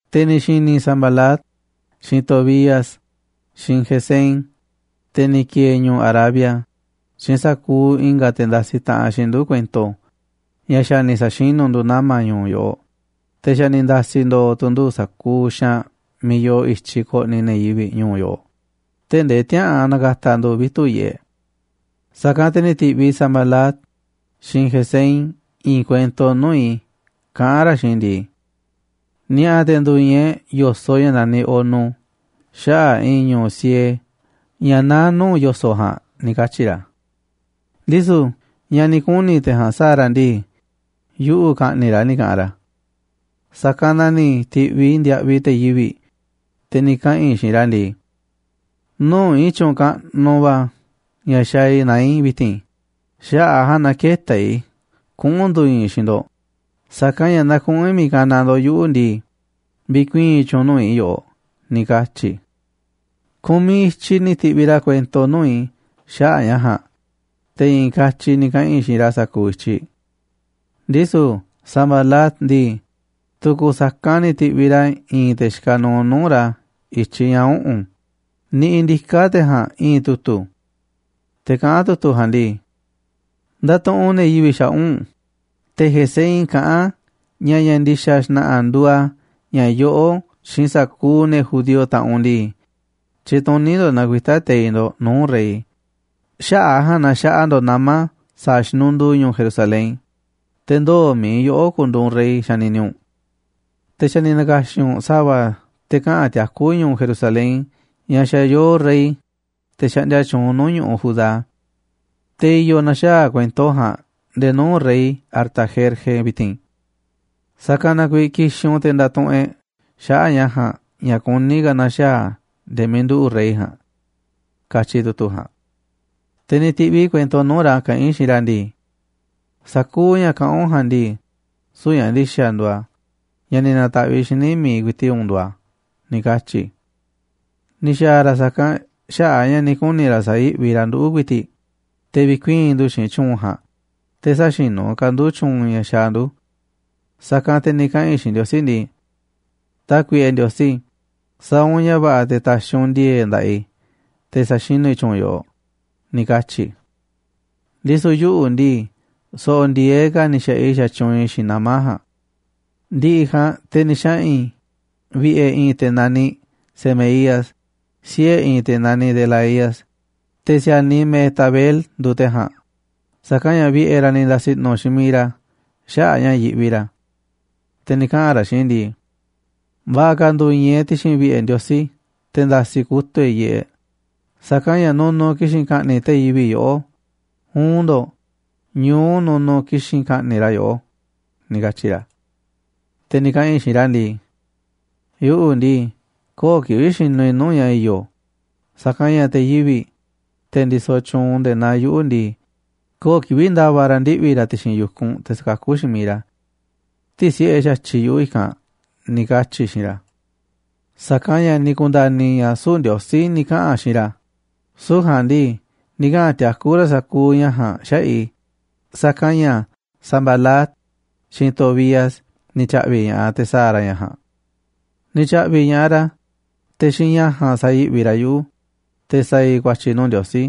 Te̱ ni̱ xi̱ni̱ Sanbalat, xiinꞌ Tobías, xiinꞌ Gesem, te̱ ni̱ ki̱e̱e̱ ñu̱ꞌu̱ Arabia, xiinꞌ sa̱kuuꞌ i̱nga̱ te̱ ndasiꞌ taꞌanꞌ xiinꞌ ndu̱ kuento ña̱ xa̱ ni̱ sa̱xinu̱ ndu̱ nama̱ ñu̱u̱ yoꞌoꞌ, te̱ xa̱ ni̱ nda̱si̱ ndo̱o̱ tu̱ ndu̱ sa̱kuuꞌ xaanꞌ miiꞌ yoo i̱tyiꞌ koꞌniꞌ ne̱ yivi̱ꞌ ñu̱u̱ yoꞌoꞌ, tee̱ꞌ ndee tiäa̱ꞌan na̱ka̱ta̱ ndu̱ vitu̱ꞌ yiꞌeꞌ, sa̱kanꞌ te̱ ni̱ ti̱ꞌviꞌ Sanbalat xiinꞌ Gesem i̱i̱n kuento nuu̱ꞌ i̱ kaꞌán ra̱ xiinꞌ i̱ ndii: ―Ni̱a̱ꞌa̱ te̱ ndu̱i̱i̱n e̱ꞌ yo̱soꞌ ña̱ naniꞌ Ono xaꞌa̱ꞌ i̱i̱n ñu̱u̱ siee ña̱ naá nuu̱ꞌ yo̱soꞌ ja̱a̱nꞌ ―ni̱ katyi̱ ra̱. Ndisu̱ ña̱ ni̱ kuni̱ te̱ ja̱a̱nꞌ sa̱a̱ ra̱ ndii, yuꞌu̱ ka̱ꞌni̱ꞌ ra̱ ni̱ ka̱ꞌanꞌ ra̱. Sa̱kanꞌ na ni̱ ti̱ꞌviꞌ i̱ ndiaꞌviꞌ te̱ yivi̱ꞌ, te̱ ni̱ kaꞌa̱n i̱ xiinꞌ ra̱ ndii: “Nuu̱ꞌ i̱i̱n tyu̱u̱n kaꞌnuꞌ va̱ ña̱ xaaꞌ i̱ naá i̱ vi̱ti̱n, xaꞌa̱ꞌ a̱ ja̱a̱nꞌ na kë̱ta̱ i̱ kuꞌu̱n ndu̱i̱i̱n i̱ xiinꞌ ndo̱ꞌ, sa̱kanꞌ ña̱ naaꞌ kuꞌu̱n i̱ miiꞌ kanaꞌ ndo̱ꞌ yuꞌu̱ ndii, vi̱kuii̱n tyu̱u̱n nuu̱ꞌ i̱ yoꞌoꞌ”, ni̱ katyi̱ i̱. Ku̱miꞌ i̱tyiꞌ ni̱ ti̱ꞌviꞌ ra̱ kuento nuu̱ꞌ i̱ xaꞌa̱ꞌ ña̱ ja̱a̱nꞌ, te̱ i̱i̱n katyi ni̱ kaꞌa̱n i̱ xiinꞌ ra̱ sa̱kuuꞌ i̱tyiꞌ. Ndisu̱ Sanbalat ndii, tu̱ku̱ sa̱kanꞌ ni̱ ti̱ꞌviꞌ ra̱ i̱i̱n te̱ xikaꞌ nuuꞌ nuu̱ꞌ ra̱ i̱tyiꞌ ña̱ uꞌu̱n, niꞌiꞌ ndiká te̱ ja̱a̱nꞌ i̱i̱n tu̱tu̱. Te̱ kaꞌán tu̱tu̱ ja̱a̱nꞌ ndii: “Ndatuꞌunꞌ ne̱ yivi̱ꞌ xaꞌa̱ꞌ u̱nꞌ, te̱ Gesem kaꞌán ña̱ ña̱ ndi̱xa̱ xna̱ꞌa̱ nduuꞌ a̱, ña̱ yoꞌó xiinꞌ sa̱kuuꞌ ne̱ judío, taꞌanꞌ u̱nꞌ ndii, tyituní ndo̱ꞌ na̱kuita̱ teiꞌ ndo̱ꞌ nuu̱ꞌ rey, xaꞌa̱ꞌ a̱ ja̱a̱nꞌ na xaꞌa ndo̱ꞌ nama̱ sa̱a̱ xinunduu ñu̱u̱ Jerusalén, te̱ ndoo̱ mi̱iꞌ yoꞌó ku̱ndu̱u̱ u̱nꞌ rey, xanini u̱nꞌ. Te̱ xa̱ ni̱ na̱ka̱xi̱n u̱nꞌ sa̱va̱ te̱ kaꞌa̱n tiakú ñu̱u̱ Jerusalén ña̱ xa̱ yoo rey, te̱ xaꞌndia tyuunꞌ nuu̱ꞌ ñu̱ꞌuꞌ Judá. Te̱ i̱yo̱ na̱xaa̱ kuento ja̱a̱nꞌ nde̱e̱ nuu̱ꞌ rey Artajerje vi̱ti̱n. Sa̱kanꞌ na kuiiꞌ ki̱xi̱n u̱nꞌ te̱ nda̱tuꞌunꞌ e̱ꞌ xaꞌa̱ꞌ ña̱ ja̱a̱nꞌ ña̱ kuní ka̱ na̱xaa̱ a̱ nde̱e̱ miiꞌ nduꞌu̱ꞌ rey ja̱a̱nꞌ», katyi tu̱tu̱ ja̱a̱nꞌ. Te̱ ni̱ ti̱ꞌviꞌ i̱ kuento nuu̱ꞌ ra̱ kaꞌán i̱ xiinꞌ ra̱ ndii: “Sa̱kuuꞌ ña̱ kaꞌán u̱nꞌ ja̱a̱nꞌ ndii, süu̱ꞌ ña̱ ndi̱xa̱ nduuꞌ a̱, ña̱ ni̱ na̱ta̱ꞌviꞌ xíniꞌ mi̱iꞌ ku̱i̱ti̱ꞌ u̱nꞌ nduuꞌ a̱”, ni̱ katyi̱ i̱. Ni̱ xa̱a̱ ra̱ sa̱kanꞌ xaꞌa̱ꞌ a̱ ña̱ ni̱ kuni̱ ra̱ sa̱yi̱ꞌvi ra̱ nduꞌu̱ ku̱i̱ti̱ꞌ, te̱ vi̱kuii̱n ndu̱ xiinꞌ tyu̱u̱n ja̱a̱nꞌ, te̱ sä̱xinu̱ ka̱ ndu̱ tyu̱u̱n ña̱ xaaꞌ ndu̱. Sa̱kanꞌ te̱ ni̱ kaꞌa̱n i̱ xiinꞌ Ndiosí ndii: ―Tákuiꞌe Ndiosí, sa̱a̱ u̱nꞌ ña̱ va̱ꞌa̱ te̱ ta̱xi̱ u̱nꞌ ndi̱e̱e̱ꞌ nda̱ꞌaꞌ i̱ te̱ sa̱xinu̱ i̱ tyu̱u̱n yoꞌoꞌ ―ni̱ katyi̱ i̱. Ndisu̱ yuꞌu̱ ndii, so̱ꞌo̱ ndi̱e̱eꞌ ka̱ ni̱ xa̱ꞌaꞌ i̱ xatyuunꞌ i̱ xiinꞌ nama̱ ja̱a̱nꞌ. Ndi̱ꞌi̱ ja̱a̱nꞌ, te̱ ni̱ xaꞌa̱n i̱ vi̱ꞌe̱ i̱i̱n te̱ naniꞌ Semaías, siꞌe̱ i̱i̱n te̱ naniꞌ Delaía, te̱ si̱a̱niꞌ Mehetabel nduuꞌ te̱ ja̱a̱nꞌ, sa̱kanꞌ ña̱ vi̱ꞌe̱ ra̱ ni̱ nda̱si̱ i̱ꞌnu̱ xiinꞌ miiꞌ ra̱ xaꞌa̱ꞌ a̱ ña̱ yiꞌvi ra̱. Te̱ ni̱ kaꞌa̱n ra̱ xiinꞌ i̱ ndii: ―Va̱ꞌa̱ ka̱ ndu̱i̱i̱n e̱ꞌ ti̱xi̱n vi̱ꞌe̱ Ndiosí te̱ nda̱si̱ kutu̱ꞌ e̱ꞌ yiꞌeꞌ, sa̱kanꞌ ña̱ nunuꞌ ki̱xi̱n ka̱ꞌni̱ꞌ te̱ yivi̱ꞌ yoꞌó, uun ndo̱ꞌ, ñu̱u nunuꞌ ki̱xi̱n ka̱ꞌni̱ꞌ ra̱ yoꞌó ―ni̱ katyi̱ ra̱. Te̱ ni̱ kaꞌa̱n i̱ xiinꞌ ra̱ ndii: ―Yuꞌu̱ ndii, köo̱ꞌ kivi̱ꞌ xinuꞌ i̱ nuu̱ꞌ ña̱ i̱yo̱, sa̱kanꞌ ña̱ te̱ yivi̱ꞌ, te̱ ndisoꞌ tyuunꞌ nde̱e̱ naa yuꞌu̱ ndii, köo̱ꞌ kivi̱ꞌ nda̱va̱ ra̱ ndiꞌvi̱ ra̱ ti̱xi̱n yu̱kunꞌ te̱ sa̱kakú xiinꞌ miiꞌ ra̱. Tï̱si̱ꞌe xa̱tyiꞌ yuꞌu̱ i̱kanꞌ ―ni̱ katyi̱ i̱ xiinꞌ ra̱. Sa̱kanꞌ ña̱ ni̱ ku̱nda̱ni̱ i̱ ña̱ süu̱ꞌ Ndiosí ni̱ kaꞌa̱n xiinꞌ ra̱, süu̱ꞌ ja̱a̱nꞌ ndii, ni̱ kaꞌa̱n tiakú ra̱ sa̱kuuꞌ ña̱ ja̱a̱nꞌ xaꞌa̱ꞌ i̱, sa̱kanꞌ ña̱ Sanbalat, xiinꞌ Tobías ni̱ tya̱ꞌvi̱ꞌ ña̱ꞌaꞌ te̱ sa̱a̱ ra̱ ña̱ ja̱a̱nꞌ. Ni̱ tya̱ꞌvi̱ꞌ ña̱ꞌaꞌ ra̱, te̱ xiinꞌ ña̱ ja̱a̱nꞌ sa̱yi̱ꞌvi ra̱ yuꞌu̱, te̱ sa̱a̱ i̱ ku̱a̱tyi̱ nuu̱ꞌ Ndiosí,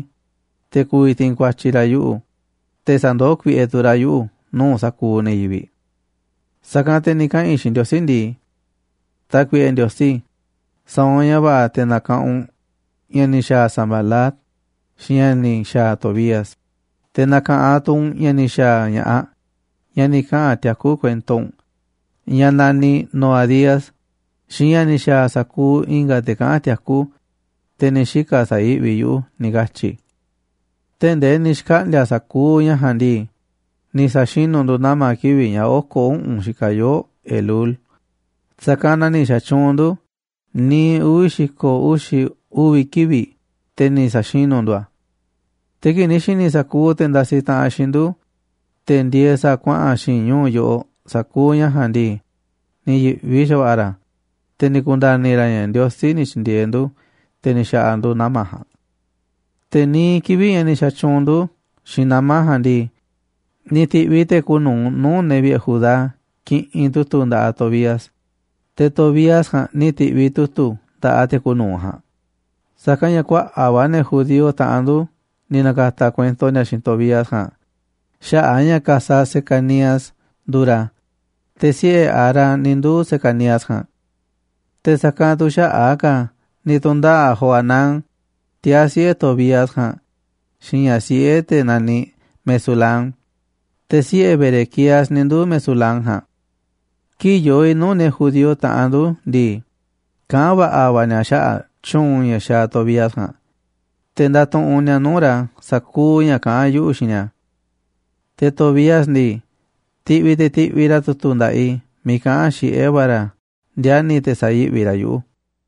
te̱ ku̱vi̱ ti̱i̱n ku̱a̱tyi̱ ra̱ yuꞌu̱, te̱ sa̱ndoó kuiꞌe tu̱ ra̱ yuꞌu̱ nuu̱ꞌ sa̱kuuꞌ ne̱ yivi̱ꞌ. Sa̱kanꞌ te̱ ni̱ kaꞌa̱n i̱ xiinꞌ Ndiosí ndii: ―Tákuiꞌe Ndiosí, sa̱a̱ u̱nꞌ ña̱ va̱ꞌa̱ te̱ na̱ka̱ꞌanꞌ u̱nꞌ ña̱ ni̱ xa̱a̱ Sanbalat, xiinꞌ ña̱ ni̱ xa̱a̱ Tobías, te̱ na̱ka̱ꞌanꞌ tu̱ u̱nꞌ ña̱ ni̱ xa̱a̱ ña̱ꞌaꞌ, ñaꞌ ni̱ kaꞌa̱n tiakú kuento u̱nꞌ, ñaꞌ naniꞌ Noadías, xiinꞌ ña̱ ni̱ xa̱a̱ sa̱kuuꞌ i̱nga̱ te̱ kaꞌán tiakú, te̱ ni̱ xika̱ sa̱yi̱ꞌvi yuꞌu̱ ―ni̱ katyi̱ i̱. Tee̱ꞌ ndee ni̱ xkaꞌndi̱a̱ sa̱kuuꞌ ña̱ ja̱a̱nꞌ ndii, ni̱ sa̱xinu̱ ndu̱ nama̱ kivi̱ꞌ ña̱ oko̱ uꞌu̱n xikaꞌ yoo̱ꞌ Elul, sa̱kanꞌ na ni̱ xa̱tyuunꞌ ndu̱ niiꞌ uvi̱ xi̱ko̱ uxi̱ uvi̱ kivi̱ꞌ te̱ ni̱ sa̱xinu̱ ndu̱ a̱. Te̱ kii̱ꞌ ni̱ xi̱ni̱ sa̱kuuꞌ te̱ ndasiꞌ taꞌanꞌ xiinꞌ ndu̱, te̱ ndieeꞌ sa̱a̱ kuaꞌa̱n xi̱i̱nꞌ ñu̱u̱ yoꞌoꞌ sa̱kuuꞌ ña̱ ja̱a̱nꞌ ndii, ni̱ yi̱ꞌvi xa̱va̱ꞌa̱ ra̱, te̱ ni̱ ku̱nda̱ni̱ ra̱ ña̱ Ndiosí ni̱ tyi̱ndi̱e̱eꞌ ndu̱, te̱ ni̱ xa̱ꞌa̱ ndu̱ nama̱ ja̱a̱nꞌ. Te̱ niiꞌ kivi̱ꞌ ña̱ ni̱ xa̱tyuunꞌ ndu̱ xiinꞌ nama̱ ja̱a̱nꞌ ndii, ni̱ ti̱ꞌviꞌ te̱ kuuꞌ nu̱uꞌ nuu̱ꞌ ne̱ vi̱ꞌe̱ Judá kiꞌinꞌ tu̱tu̱ nda̱ꞌaꞌ Tobías, te̱ Tobías ja̱a̱nꞌ ni̱ ti̱ꞌviꞌ tu̱tu̱ nda̱ꞌaꞌ te̱ kuuꞌ nu̱uꞌ ja̱a̱nꞌ, sa̱kanꞌ ña̱ kuaꞌa̱ꞌ va̱ ne̱ judío, taꞌanꞌ ndu̱, ni̱ na̱ka̱ta̱ kuento ni̱a̱ xiinꞌ Tobías ja̱a̱nꞌ xaꞌa̱ꞌ a̱ ña̱ ka̱saꞌ Secanías nduuꞌ ra̱, te̱ siꞌe̱ Ara ni̱ nduu̱ Secanías ja̱a̱nꞌ. Te̱ sa̱kanꞌ tu̱ xaꞌa̱ꞌ a̱ ka̱ ni̱ tu̱ndaꞌa̱ꞌ Johanán, tiaa̱ siꞌe̱ Tobías ja̱a̱nꞌ, xiinꞌ ña̱ꞌaꞌ siꞌe̱ te̱ naniꞌ Mesulam, te̱ siꞌe̱ Berequías ni̱ nduu̱ Mesulam ja̱a̱nꞌ. Kii̱ꞌ yoo i̱ nuu̱ꞌ ne̱ judío, taꞌanꞌ ndu̱ ndii, kaꞌán va̱ꞌa̱ va̱ ni̱a̱ xaꞌa̱ꞌ tyu̱u̱n ña̱ xaaꞌ Tobías ja̱a̱nꞌ, te̱ ndatuꞌunꞌ ni̱a̱ nuu̱ꞌ ra̱ sa̱kuuꞌ ña̱ kaꞌán yuꞌu̱ xiinꞌ ni̱a̱. Te̱ Tobías ndii, tiꞌviꞌ te̱ tiꞌviꞌ ra̱ tu̱tu̱ nda̱ꞌaꞌ i̱ miiꞌ kaꞌán xiꞌé va̱ ra̱ ndiani̱ te̱ sa̱yi̱ꞌvi ra̱ yuꞌu̱.